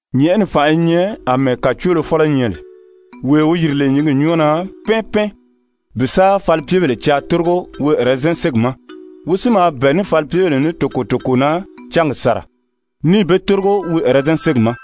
«Nyɛ̀ʔɛni fànʔa i nyɛ àmɛɛ kàcoolofɔlɔ nyɛ lè, wee wi yiri lè nyǐngi nyɔ́ɔ na pɛ́ɛn pɛ́ɛn bi sa falipyebèlē caa tórigo wi ɛrɛzɛn ségi ma. Wi si maa bɛ̀ɛ ní falipyebèle ní toko toko na cángi sàra, níì be tórigo wi ɛrɛzɛn ségi ma.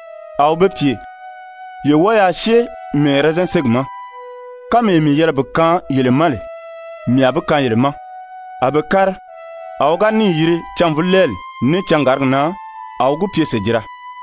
A wi be pye: ‹Ye wɔ́ɔ yaa syée mii ɛrɛzɛn ségi ma. Kánmee mii yɛlɛ bi kaan yele ma lè, mii a bi kaan yele ma.› A be kári. A wi ga níì yiri cânvulɛɛli ní cangàrigi na, a wi gi pye sèjira.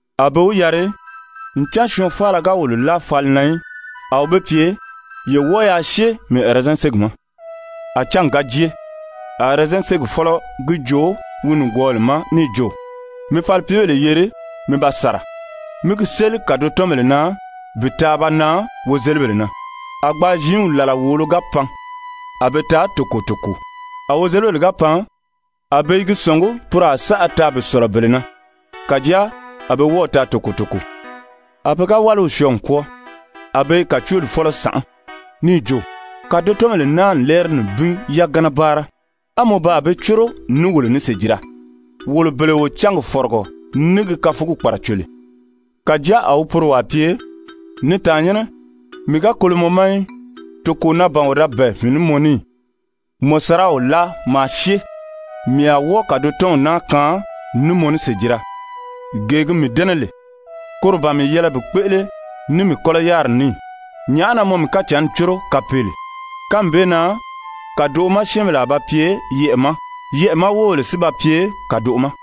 A be wi yari: ‹Ncan syɔɔn faala ga wolo láa fali na í.› A wi be pye: ‹Ye wɔ́ɔ yaa syée mii ɛrɛzɛn ségi ma.› A cángi ga jée, a ɛrɛzɛn ségi fɔ́lɔ gi joo wi nìgwɔɔw ma níì jo: ‹Mi falipyebèle yeri mi ba sàra. Mi gi séli kàdotɔnbèle na bi taa ba nan wozelibèle na.› A gbaa ziinw làla wòolo ga pan, a be taa toko toko. A wozelibèle ga pan, a be i gi sɔ̀ngí poro a saʔa taa bi sɔ̀lɔ bele na. Kàjáa a be wɔ́ɔ̀ taa toko toko. A pe ga wáliw syɔɔ n kwɔ́ɔ, a be i kàcooli fɔ́lɔ sànʔá, níì jo: ‹Kàdotɔnbèle naa n lɛ́ɛri nibin yagana báara, á mɔ baa be córo ní wolo ní sèjira, wolo bele wo cángi fɔ̀rɔgɔ ní gi káfugi kpàraco lè.› Kàjáa a wi poro wàa pye: ‹Ni tàannyɛnnɛ, mii ga kolo mɔ ma í. Toko na ban wo da bɛ̀ɛ mii ní mɔ ní ì? Mɔ saraw láa maa syée, mii a wɔ́ɔ kàdotɔnw naa kaan ní mɔ ní sèjira. Gee gi mii dɛ́nɛ lè, koro ban mii yɛlɛ bi kpéʔele ní mii kɔ́lɔ yáriri ní ì? Nyàʔá na mɔ mii kacǎnni córo kapeele?› Kánmi bee na kàdoʔo ma syɛ́ɛnbèle a ba pye yɛʔɛ̀ ma, yɛʔɛ̀ ma wóbèle si ba pye kàdoʔo ma.»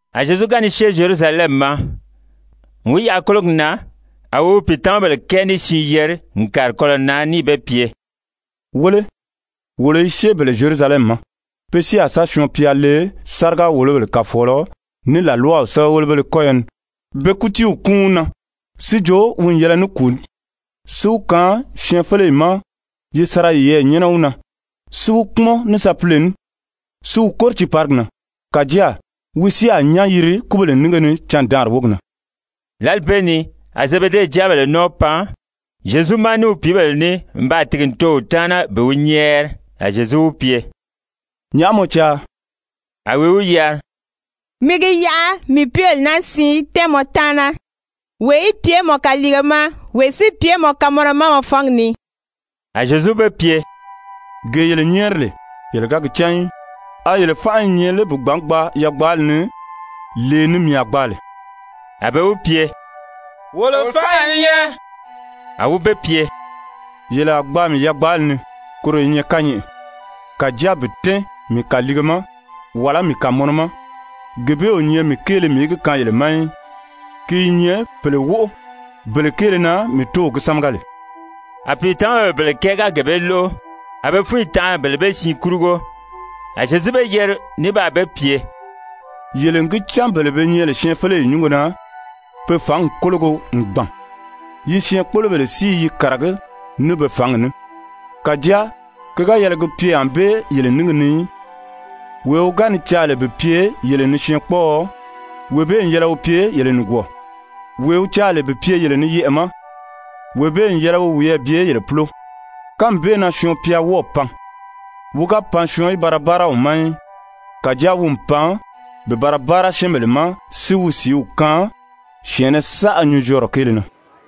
A Zyezu ga ni syée Zyerusalɛmi ma, n wi yaʔa kólogi na, a wi wi pìitamabèle kɛɛ ní siin yeri n kàri kɔlɔ̀ na níì be pye: «Wéle, wolo i syée bele Zyerusalɛmi ma, pe si a sa Syɔɔn-pya le sáriga-wòlobèle kàfɔɔlɔ ní làlwaw sɛ́bɛwelebéle kɔ́yɔ ni be kútiiw kúun wi na, si jo wi n yɛlɛ ní kùu ní, si wi kaan syɛɛnfeleyi ma yi sa ra yiyɛɛ nyɛ́nɛ wi na, si wi kpúmɔn ní sapile ní si wi kóri tiiparigi na. Kàjáa wi si a nyán yiri kúbèle nínge ni candaanri wógi na.» Lǎli bee ni a Zebede jáabèle nɔ́ɔ pan Zyezu ma ní wi pìíbèle ní n baa tìgi n too wi taana bi wi nyɛ́ɛri. A Zyezu wi pye: «Nyàʔá mɔ caa?» A wi wi yari: «Mi gi yaʔa mii pìíbèle naa siin í tɛ́ɛn mɔ taana, wee í pye mɔ kaliige ma, wee si pye mɔ kamɔnɔ ma mɔ fangi ni.» A Zyezu be pye: «Gee yele nyɛ́ɛri lè, yele ga gi cán í. A yele fánʔa i nyɛ lé bi gbǎn gbaa yagbaali ni, lee ni mii a gbaa lè?» A be wi pye: «Wolo fánʔa i nyɛ.» A wi be pye: «Yele a gbaa mii yagbaali ni, koro i nyɛ kányɛʔɛ, kàjáa bi tɛ́ɛn mii kàliige ma, wàlá mii kàmɔnɔ ma, gee bee o nyɛ mii kéele mii í gi kaan yele ma í. Ki i nyɛ pèle wóʔo bele kéele na mii Tóow gi sámaga lè.» A pìitamabèle bele kɛɛ ga gee bee lóʔo, a be fúnyi tanʔa bele bee siin kurugo. A Zyezu be yeri ní baa be pye: «Yele n gi cán bele be nyɛ lè syɛɛnfeleyi nyúngo na, pe fǎngi kólogo n gbàn. Yi syɛɛnkpolobèle si i yi kàragí ní be fǎngi ní. Kàjáa ki ga yɛlɛ gi pye ànbée yele níngi ni í. Wee wi ga ni caa lè bi pye yele ni syɛɛnkpɔɔɔ, wee bee n yɛlɛ wi pye yele nìgwɔɔ. Wee wi caa lè bi pye yele ni yɛʔɛ̀ ma, wee bee n yɛlɛ wi wiyɛɛ bye yele púlo. Kánmi bee na Syɔɔn-pya wɔ́ɔ̀ pan, wi ga pan syɔɔn í ba ra báara wi ma í. Kàjáa wi n pan bi ba ra báara syɛ́ɛnbèle ma si wi sìíw kaan syɛ̀ɛnnɛ saʔa nyunzyɔɔrɔ kéele na.»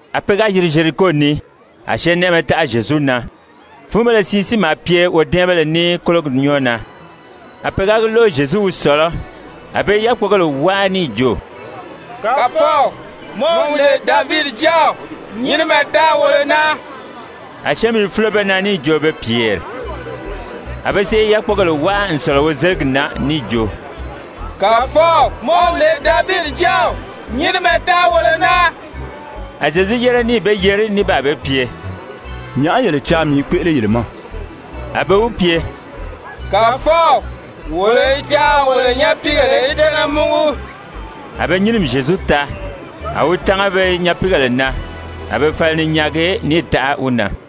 A pe ga yiri Zyeriko ni, a syɛɛnnɛʔɛmɛ taʔa Zyezu na. Fúunbéle siin si maa pye wodɛ́ɛnbéle ní kólogi nyɔ́ɔ na. A pe ga lóʔo Zyezu wi sɔ̀lɔ́, a be i yákpogèle wáa níì jo: «Kàfɔw, mɔ wi lè Davidi Jáaw, nyinimɛ taa wolo na.» A syɛ́ɛnmi i fúlo be na níì jo be pyèri. A be sèʔé i yákpogèle wáa n sɔ̀lɔ wozeligi na níì jo: «Kàfɔw, mɔ wi lè Davidi Jáaw, nyinimɛ taa wolo na.» A Zyezu yére níì be yeri ní baa be pye: «Nyàʔá yele caa mii í kpéʔele yele ma?» A be wi pye: «Kàfɔw, wolo i caa wolo nyapiigèle í tɛ́nɛ múgu.» A be nyínimi Zyezu taa, a wi tánga be nyapiigèle na, a be fala ni nyaagi níì taʔa wi na.